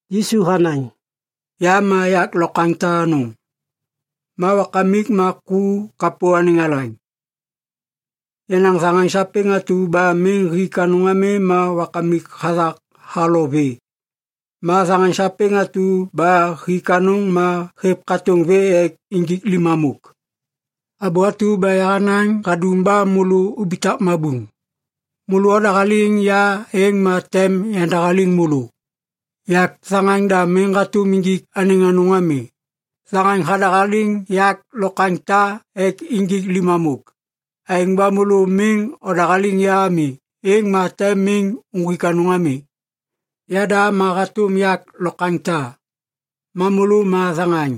Yisu hanaŋ, “Ya ma yak lokwaŋ ta anôŋ. Ma Wakamik ma ku kapô anêŋ alaŋ. Yenaŋ thaŋaŋ sapêŋ atu ba miŋ hik anôŋ ami ma Wakamik hathak halo vê. Ma thaŋaŋ sapêŋ atu ba hik anôŋ ma hêv katôŋ vê ek injik limamôk. Abô atu ba yahanaŋ hadum ba môlô ubitak mabuŋ. Môlô odahaliŋ ya êŋ ma tem yandahaliŋ môlô. Yak thaŋaŋ da miŋ hatôm injik anêŋ anôŋ ami. Thaŋaŋ hadahaliŋ yak lokwaŋ ta ek injik limamôk. Aêŋ ba môlô miŋ odahaliŋ ya ami, êŋ ma tem miŋ uŋgwik anôŋ ami. “Yada ma hatôm yak lokwaŋ ta. Ma môlô ma thaŋaŋ.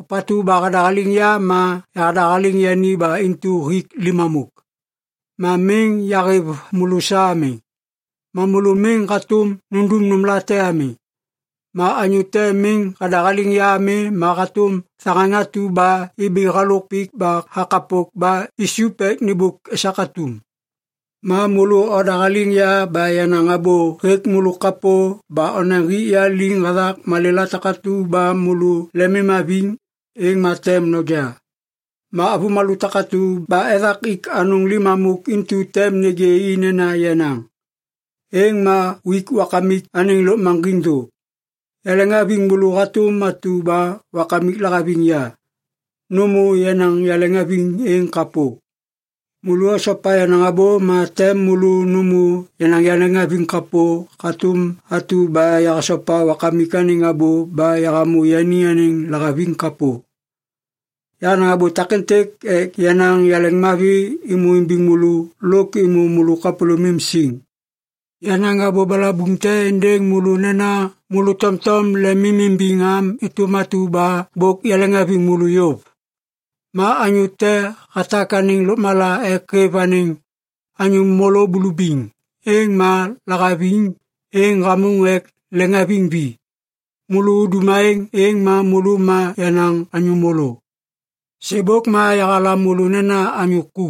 Ôpatu ba hadahaliŋ ya ma yahadahaliŋ yani ba intu hik limamôk. Ma miŋ yahêv môlô sa ami, ma môlô miŋ hatôm nundum nômlate ami. Ma anyô te miŋ hadahaliŋ ya ami ma hatôm thaŋaŋ atu ba ibi halôk pik ba hakapok ba isup ek nêmbôk esak atum. Ma môlô odahaliŋ ya ba yenaŋ abô hêk môlô kapô ba onaŋ hik ya liŋ hathak malêla takatu ba môlô lemimhaviŋ, êŋ ma tem noja. Ma avômalô takatu ba ethak ik anôŋ limamôk intu tem nêgê i nena yenaŋ. Êŋ ma uik Wakamik anêŋ lôkmaŋgiŋ thô. “Yaleŋhaviŋ môlô hatôm atu ba Wakamik lahaviŋ ya. Nômô yenaŋ yaleŋhaviŋ êŋ kapô. Môlô osopa yenaŋ abô ma tem môlô nômô yenaŋ yaleŋhaviŋ kapô hatôm atu ba yahasopa Wakamik anêŋ abô ba yahamô yani anêŋ lahaviŋ kapô. Yahanaŋ abô takêntêk ek yenaŋ yaleŋmavi êmô imbiŋ môlô lôk êmô môlô kapôlômim siŋ. Yanaŋ abô balabuŋ te êndêŋ môlô nena môlô tomtom lemimimbiŋ am êtôm atu ba bôk yaleŋhaviŋ môlô yôv. Ma anyô te hatak anêŋ lôkmala ek hêv anêŋ anyô môlô bulubiŋ, êŋ ma lahaviŋ êŋ hamôŋ ek leŋiŋhaviŋ vi. Môlô udum aêŋ êŋ ma môlô ma yenaŋ anyô môlô. Sêbôk ma yahalam môlô nena anyô ku.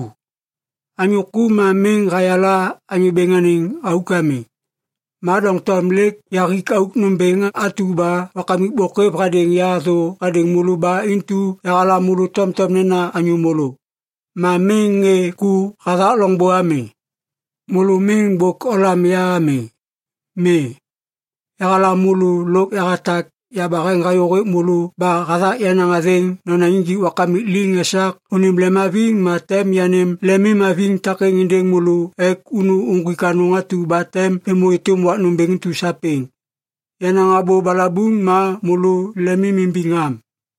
Anyô ku ma miŋ hayala anyô bêŋ anêŋ auk ami. Ma doŋtom lêk yahik auk nômbêŋ atu ba Wakamik bôk hêv hadêŋ ya thô hadêŋ môlô ba intu yahalam môlô tomtom nena anyô môlô. Ma miŋ ŋê ku hathak loŋbô ami. Môlô miŋ bôk olam ya ami. Mi. Yahalam môlô lôk yahatak yabaheŋ hayô hêk môlô ba hathak yenaŋ athêŋ nonaŋ injik Wakamik liŋ esak unim lemimhaviŋ ma tem yanêm lemimhaviŋ takêŋ êndêŋ môlô ek unu uŋgwik anôŋ atu ba tem êmô êtôm wak nômbêŋ intu sapêŋ. Yenaŋ abô balabuŋ ma môlô lemimimbiŋ am.”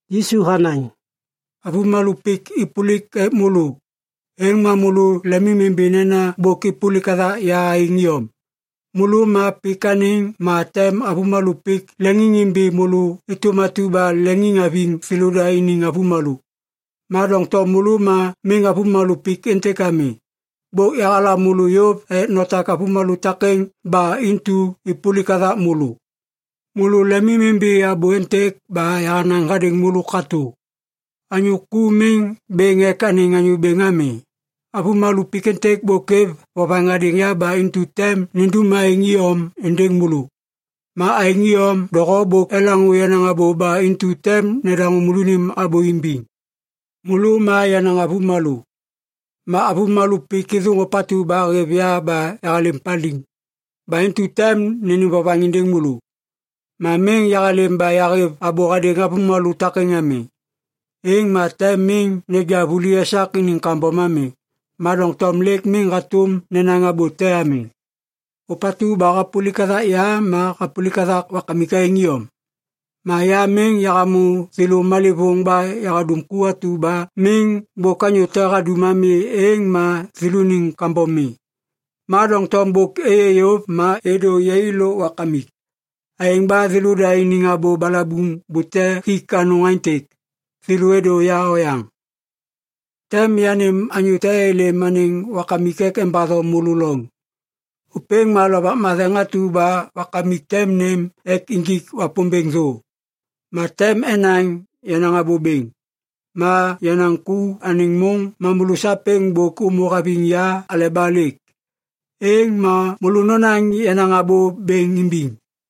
Yisu hanaŋ, “Avômalô pik êpôlik ek môlô, êŋ ma môlô lemimimbi nena bôk êpôlik hathak ya aêŋ iyom. Môlô ma pik anêŋ ma tem avômalô pik leŋiŋimbiŋ môlô êtôm atu ba leŋiŋ haviŋ thêlôda iniŋ avômalô. Ma doŋtom môlô ma miŋ avômalô pik êntêk ami. Bôk yahalam môlô yôv ek notak avômalô takêŋ ba intu êpôlik hathak môlô. Môlô lemimimbi abô êntêk ba yahanaŋ hadêŋ môlô katô. ‘Anyô ku miŋ bêŋ ek anêŋ anyô bêŋ ami.’ Avômalô pik êntêk bôk êv vovaŋ hadêŋ ya ba intu tem nindum aêŋ iyom êndêŋ môlô. Ma aêŋ iyom doho bôk elaŋô yenaŋ abô ba intu tem nedaŋô môlônim abô imbiŋ. Môlô ma yenaŋ avômalô. Ma avômalô pik êthôŋ ôpatu ba hêv ya ba yahalêm paliŋ. Ba intu tem nênêm vovaŋ êndêŋ môlô. Ma miŋ yahalêm ba yahêv abô hadêŋ avômalô takêŋ ami, êŋ ma tem miŋ neja vuli esak iniŋ kambom ami. Ma doŋtom lêk miŋ hatôm nenaŋ abô te ami. Ôpatu ba hapôlik hathak ya ma hapôlik hathak Wakamik aêŋ iyom. Ma ya miŋ yahamô thêlô malêvôŋ ba yahadum ku atu ba miŋ bôk anyô te hadum ami êŋ ma thêlôniŋ kambom mi. Ma doŋtom bôk êyê yôv ma êdô yai lôk Wakamik. Aêŋ ba thêlôda iniŋ abô balabuŋ bute hik anôŋ aêntêk, ‘Thêlô êdô ya oyaŋ.’ “Tem yanêm anyô te êlêm anêŋ Wakamik ek embatho môlô loŋ. Ôpêŋ ma Lovak Matheŋ atu ba Wakamik tem nêm ek injik Wapômbêŋ thô. Ma tem enaŋ yenaŋ abô bêŋ. Ma yenaŋ ku anêŋ môŋ ma môlô sapêŋ bôk ômô haviŋ ya aleba lêk. Êŋ ma môlô nonaŋ yenaŋ abô bêŋ imbiŋ.